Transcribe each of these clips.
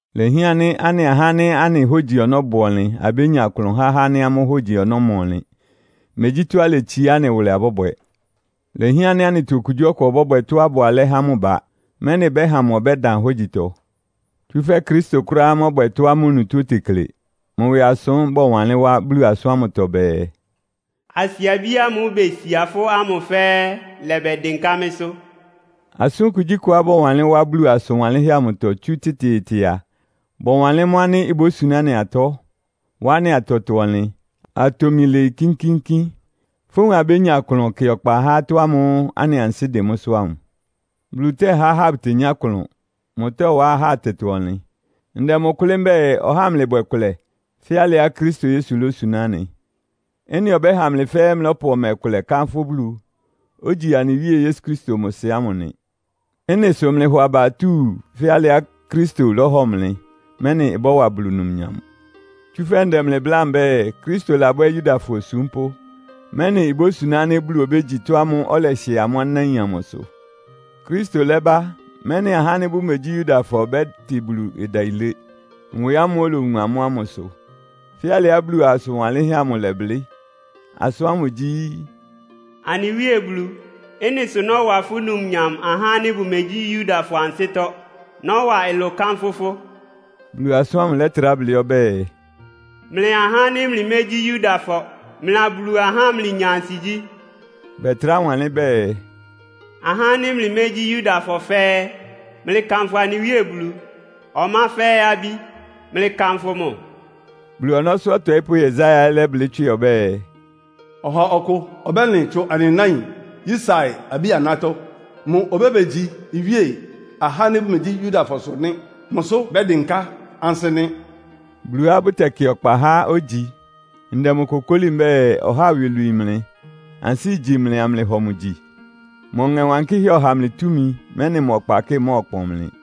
Ilehián ánɩ́ anɩ ahá ánɩ́ anɩ hógyi ɔnɔ́ bʋ ɔnlɩn abénya klʋn há ahá ánɩ́ amʋ́ hógyi ɔnɔ́ ɩma ɔnlɩn. Megyí tɔ́á iletsiá anɩ wʋlɛ abɔ́bwɛ. Ilehián ánɩ́ anɩtɔ okugyíɔkʋ ɔbɔ́bwɛ tɔ́á ɩbʋ alɛ́ há mʋ ba, mɛ́nɩ ɩbɛ́ha mʋ ɔbɛ́dan hógyitɔ. Tsúfɛ́ Kristo kʋ́ráá mɔ́bwɛ tɔ́á mʋ onutó otekle. Mʋ ɩwɩ asʋ́n bɔwanlɩ́n wá Bulu asʋ́n ámʋtɔ bɛɛ, “Asiabí ámʋ́ʋ́ besia fʋ́ ámʋ fɛ́ɛ́ ɩlɛbɛdɩnká mɩ́sʋ́.” Asʋ́n kugyíkʋá bɔwanlɩ́n wá Bulu asʋn wanlɩ́nhɛ́ amʋtɔ tsú tɩtɩɩtɩ a, bɔwanlɩ́n mʋ́ ánɩ́ ibósuná anɩ atɔ́, wá anɩ atɛtɔ-ɔnlɩn, atomi lɩɩ kínkíínkín. Fówun abénya klʋn kɩ ɔkpa ha atɔ́ ámʋ́ʋ́ anɩ ansɩ́ dɩn mʋ́sʋ́ ámʋ. Bulu tɛ́há ahá bʋtenyá klʋn. Mʋtɔ́wá ahá atɛtɔ-ɔnlɩn. Ndɛ mʋ kʋlɩ́ mbɛ́ɛ, ɔhá amlɩbwɛ kʋlɛ, fɛ́ alɩá Kristo Yesu lósuná anɩ. Ɩ́nɩ ɔbɛ́ha mlɩ fɛ́ɛ́ mlɔ́pʋ ɔmɛ kʋlɛ kánfʋ́ Bulu, ogyi anɩ Wíe Yesu Kristo mʋ Sɩ ámʋ nɩ. Ɩ́nɩ sʋ mlɩhɔ aba atúu fɛ́ alɩá Kristo lɔ́hɔ mlɩ, mɛ́nɩ ɩbɔ́wa Bulu numnyam. Tsúfɛ́ ndɛ mlɩ bláa mbɛ́ɛ, Kristo labwɛ́ Yudafɔ osúmpʋ́, mɛ́nɩ ibósuná ánɩ́ Bulu obégyi mʋ tɔ́ ámʋ́ʋ́ ɔlɛhɩɛ amʋ́ anáin amʋsʋ. Kristo lɛ́ba, mɛ́nɩ ahá ánɩ́ bʋmegyí Yudafɔ bɛ́tɩ Bulu ɩdayilé, nwɛ ámʋ́ʋ́ olowun amʋ́ ámʋ sʋ. Fɛ́ alɩá Bulu asʋn wanlɩ́nhɛ́ amʋ ɩlɛblɩ́. Asʋ́n ámʋ gyí, “Anɩ Wíe Bulu, ɩ́nɩ sʋ nɔ́wa fʋ́ numnyam ahá ánɩ́ bʋmegyí Yudafɔ ansɩ́tɔ́. Nɔ́wa ɩlʋ kánfʋ́ fʋ́.” Bulu asʋ́n ámʋ lɛ́trá blɩ́ ɔbɛ́ɛ, “Mlɩ ahá ánɩ́ mlɩmégyí Yudafɔ, mlɩa Bulu ahá mlɩnya ansigyí!” Bɛtrá wanlɩ́n bɛɛ, “Ahá ánɩ́ mlɩmégyí Yudafɔ fɛ́ɛ́, mlɩkanfʋ anɩ Wíe Bulu. Ɔmá fɛ́ɛ́ abí, mlɩkanfʋ mʋ.” Bulu ɔnɔ́sʋ́ ɔtɔɩ́pʋ́ Yesaia ɛ́ lɛ́blɩ́ tswɩ ɔbɛ́ɛ, “Ɔha ɔkʋ ɔbɛ́lɩn tsu anɩ náin Yisai abí-anátɔ́. Mʋ obébegyi iwíe ahá ánɩ́ bʋmegyí Yudafɔsʋ nɩ́. Mʋsʋ́ bɛ́dɩnká ansɩ́ nɩ́.” Buluá bʋtɛkɩ ɔkpa há ogyi. Ndɛ mʋ kokóli mbɛ́ɛ, ɔhá ɩwɩ lwii mlɩ, ansɩ́ igyí mlɩ amlɩhɔ mʋ gyi. Mʋ Ɔŋɛ Wankɩ́hɛ́ ɔháa mlɩ túmi, mɛ́nɩ mʋ ɔkpakɩ́ɩ mɔ́ɔkpɔn mlɩ.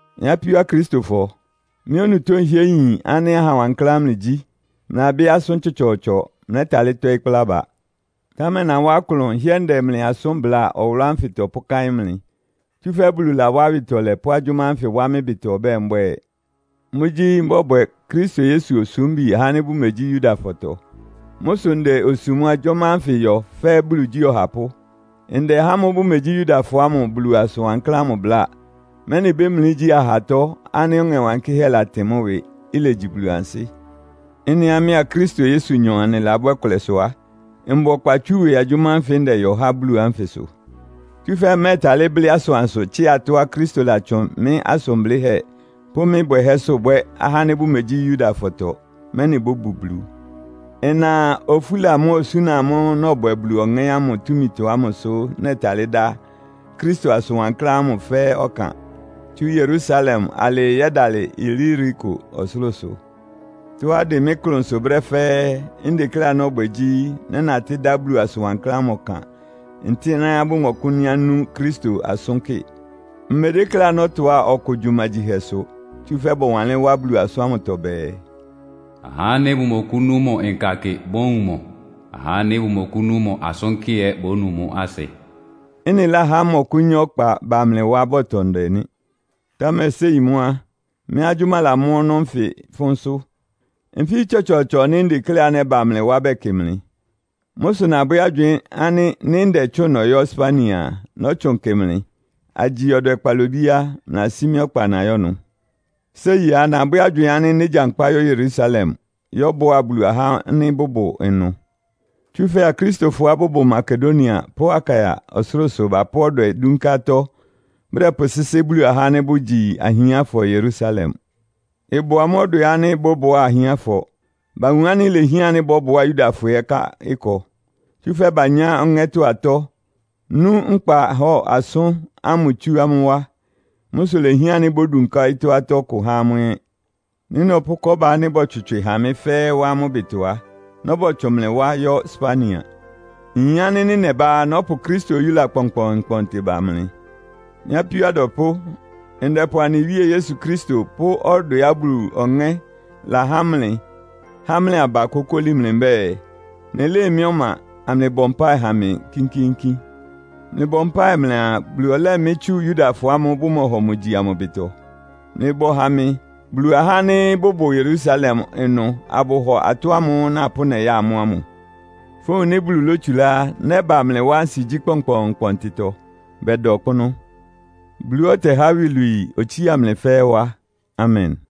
Mɩ́ apíó Akristofɔ, mɩ́ onutó nhɩ́ɛ́ nyin ánɩ́ aha wankláán mlɩgyí, mlɩlabɩ́ asʋ́n tsɔtsɔɔtsɔ, mlɛ́talɩ́ tɔ́ɩ́ kplá aba. Támɛ nawá klʋn nhɩ́ɛ́ ndɛ mlɩ asʋ́n bláa ɔwʋlʋ́ ánfɩtɔ pʋ́káɩ́n mlɩ. Tsúfɛ́ Bulu lawá awɩtɔlɛ pʋ́ agyʋ́má ánfɩ wá mɩ́ ɩbɩtɔ ɔbɛ́ɛ mbwɛ́ɛ. Mʋ́gyí, mbɔ́bwɛ Kristo Yesu osúmbi ahá ánɩ́ bʋmegyí Yudafɔtɔ. Mʋ́ sʋ ndɛ osum agyʋ́má ánfɩ yɔ fɛ́ Bulu igyí ɔhapʋ́. Ndɛ ahá ámʋ́ʋ́ bʋmegyí Yudafɔ ámʋ Bulu asʋn wankláán ámʋ bláa, mɛ́nɩ bémlí igyí ahatɔ́ ánɩ́ Ɔŋɛ Wankɩ́hɛ́ latɩn mʋ́ ɩwɩ, ilegyi Bulu ansɩ́. Ɩ́nɩá mɩ́á Kristo Yesunyɔ anɩlabwɛ́ kʋlɛ sʋ á, mbʋ ɔkpa tsú ɩwɩ agyʋ́má ánfɩ ndɛyɔ há Bulu ánfɩ sʋ. Tsúfɛ́ mmɛ́ɛtalɩ́ blɩ́ asʋansʋ tsɩ́a atɔ́á Kristo latsʋn mɩ́ asʋn blɩ́hɛ́ pʋ́ mɩ́ bwɛhɛ́sʋ́ bwɛ́ ahá ánɩ́ bʋmegyí Yudafɔtɔ, mɛ́nɩ bóbu Bulu. Ɩna ofúla mʋ́a osúna amʋ́ʋ́ nɔbwɛ Bulu Ɔŋɛ́ ámʋ túmitɔ ámʋsʋ nɛtalɩ́ dá Kristo asʋn wankláán ámʋ fɛ́ɛ́ ɔkan, tsú Yerusalem alɩɩ yɛ́dalɩ Iliriko ɔsʋlʋ́sʋ. Tɔ́á ɩdɩn mɩ́ klʋnsʋ brɛ́ fɛ́ɛ́, ndekléá nɔ́bwɛ gyí, nɛ́natɩ́ dá Bulu asʋn wankláán ámʋ ɔkan ntɩ́nɛ́á bʋmɔkʋ́nyá nú Kristo asʋ́n kɩ. Mmedékléá nɔ́tʋá ɔkʋ gyumagyihɛsʋ. Tsúfɛ́ bɔwanlɩ́n wá Bulu asʋ́n ámʋtɔ bɛɛ, “Ahá ánɩ́ bʋmɔkʋ́nú mʋ nka kɩ bówun mʋ, áhá ánɩ́ bʋmɔkʋ́nú mʋ asʋ́n kɩ ɛ́ bónu mʋ́ asɩ.” Ɩ́nɩ láhá mmɔkʋ́nyá ɔkpa ba mlɩ wá bɔtʋ ndɛ nɩ́. Támɛ séi mʋ́ á, mɩ́ agyʋ́má lamɔ́ ɔnɔ́ nfɩ fʋ́nsʋ́. Nfí tsɔtsɔɔtsɔ nɩ́ ndekléá nɛ́ba mlɩ wá bɛkɩ mlɩ. Mʋ́ sʋ nabwɛ́ agywɩɩn ánɩ́ nɩ́ ndɛtsʋ́ʋn nɔyɔ́ Spania a, nɔ́tsʋn kɩ mlɩ. Agyi ɔdwɛ kpalobí á, mlɩlasí mɩ́ ɔkpa nayɔ́ ɩnʋ. Séi á, nabwɛ́ agywɩɩn ánɩ́ négyankpá yɔ́ Yerusalem, yɔ́bʋá Bulu ahá ánɩ́ bʋbʋ ɩnʋ. Tsúfɛ́ Akristofɔá bʋbʋ Makedonia pʋ́ Akaia ɔsʋlʋ́sʋ bapʋ́ ɔdwɛ dúnká atɔ́ bʋdɛpʋsɩ́sɩ́ Bulu ahá ánɩ́ bʋgyi ahiánfɔ Yerusalem. Ɩbʋ amʋ́ ɔdwɛ ánɩ́ bɔ́bʋá ahiánfɔ. Bawun ánɩ́ ilehián ánɩ́ bɔ́bʋá Yudafɔ ɛ́ ká ɩkɔ. Tsúfɛ́ banyá Ɔŋɛ́tɔ́ atɔ́, nú nkpahɔ́ɔ asʋ́n ámʋ tsú amʋ́ wá. Mʋ́ sʋ ilehián ánɩ́ bódunká ɔyɩ́tɔ́ atɔ́ kʋ há amʋ́ ɛ́. Nɩ́ nɔpʋ́ kɔ́ba ánɩ́ bɔtswɩtswɩ ha mɩ́ fɛ́ɛ́ wá amʋ́ ɩbɩtɔ á, nɔ́bɔtsʋn mlɩ wá yɔ́ Spania. Nyin ánɩ́ nɩ́ nɛbá á, nɔ́pʋ Kristo oyúla kpɔnkpɔɔnkpɔntɩ ba mlɩ. Mɩ́ apíó adwɛpʋ́, ndɛpʋ anɩ Wíe Yesu Kristo pʋ́ ɔdwɛá Bulu Ɔŋɛ́ lahá mlɩ há mlɩ aba kókóli mlɩ mbɛ́ɛ, mlɩlɩ́ɩ mɩ́ ɔma, amlɩbɔ mpáɩ ha mɩ kínkíínkín. Mlɩbɔ mpáɩ mlɩaa, Bulu ɔlɛ́ɛ mɩ́ tsu Yudafɔ ámʋ́ʋ́ bʋmɔhɔ mʋ gyi amʋ ɩbɩtɔ. Mlɩbɔ ha mɩ, Bulu ahá ánɩ́ bʋbʋ Yerusalem ɩnʋ abʋhɔ atɔ́ ámʋ́ʋ́ napʋ́ nɛya amʋ́ ámʋ. Fówun nɩ́ Bulu lótsulá á, nɛ́ba mlɩ wá ansigyí kpɔnkpɔɔnkpɔntɩtɔ, bɛda ɔkpʋ́nʋ́. Buluá ɔtɛhá iwilwii, otsía mlɩ fɛ́ɛ́ wá. Amen!